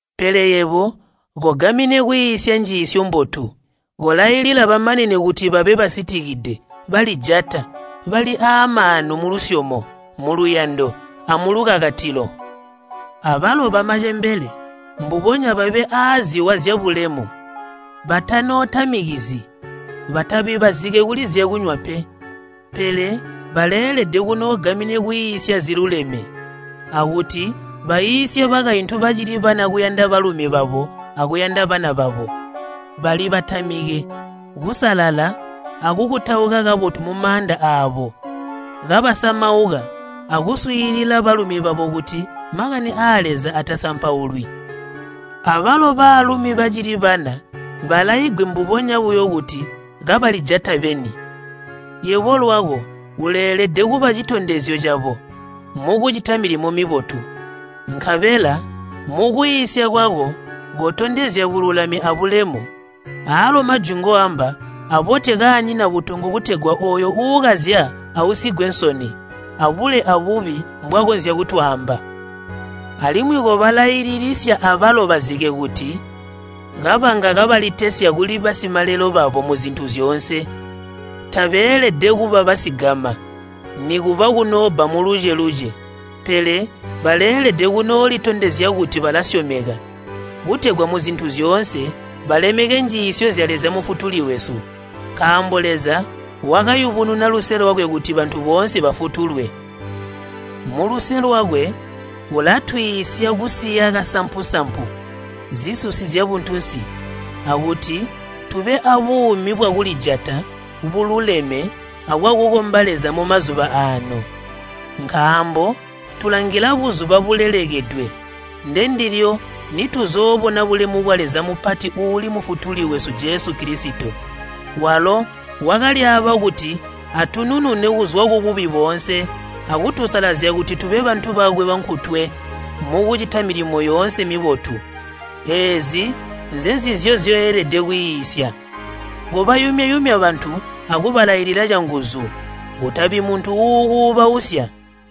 Pele yebo kogamine kwiisya njiisyo mbotu. Kolailila bamanene kuti babe basitikide, balijata, bali aamaanu mulusyomo, muluyando, amulukakatilo. Abalo bamacembele mbubonya babe aaziwa zyabulemu, batanootamikizyi, batabi bazike kuli zyakunywa pe, pele baleelede kunoogamine kwiisya ziluleme, akuti baiisye bakaintu bacili bana kuyanda balumi babo akuyanda bana babo, balibatamike, kusalala akukutauka kabotu mumaanda aabo, kabasamauka, akuswiilila balumi babo kuti makani aa Leza atasampaulwi. Abalo baalumi bacili bana balaigwe mbubonya buyo kuti kabalijata beni. Yebo lwako uleelede kuba citondezyo cabo mukucita milimo mibotu, nkabela mukwiisya kwako kotondezya bululami abulemu, aalo majwi ngoamba abote kaanyina butongo kutegwa ooyo uukazya ausigwe nsoni, abule abubi mbwakonzya kutwaamba. Alimwi kobalaililisya abalo bazike kuti kabanga kabalitesya kuli basimalelo babo muzintu zyoonse, tabeelede kuba basigama, nikuba kunoobba muluce-luce, pele baleelede kunoolitondezya kuti balasyomeka, kutegwa muzintu zyoonse balemeke njiisyo zya Leza Mufutuli wesu. Nkaambo Leza wakayubununa luse lwakwe kuti bantu boonse bafutulwe. Muluse lwakwe ulatwiisya kusiya kasampu-sampu, zisusi zyabuntunsi, akuti tube abuumi bwakulijata, bwaluleme, abwakukomba Leza mumazuba aano. Nkaambo tulangila buzuba bulelekedwe ndendilyo nituzoobona bulemu bwa Leza mupati uuli Mufutuli wesu Jesu Kilisito. Walo wakalyaaba kuti atununune kuzwa kububi boone akutusalazya kuti tube bantu bakwe bankutwe mukucita milimo yoonse mibotu. Eezi nzenzizyo nzyoelede kwiisya. Kobayumya-yumya bantu akubalailila canguzu. Kutabi muntu uukuubausya.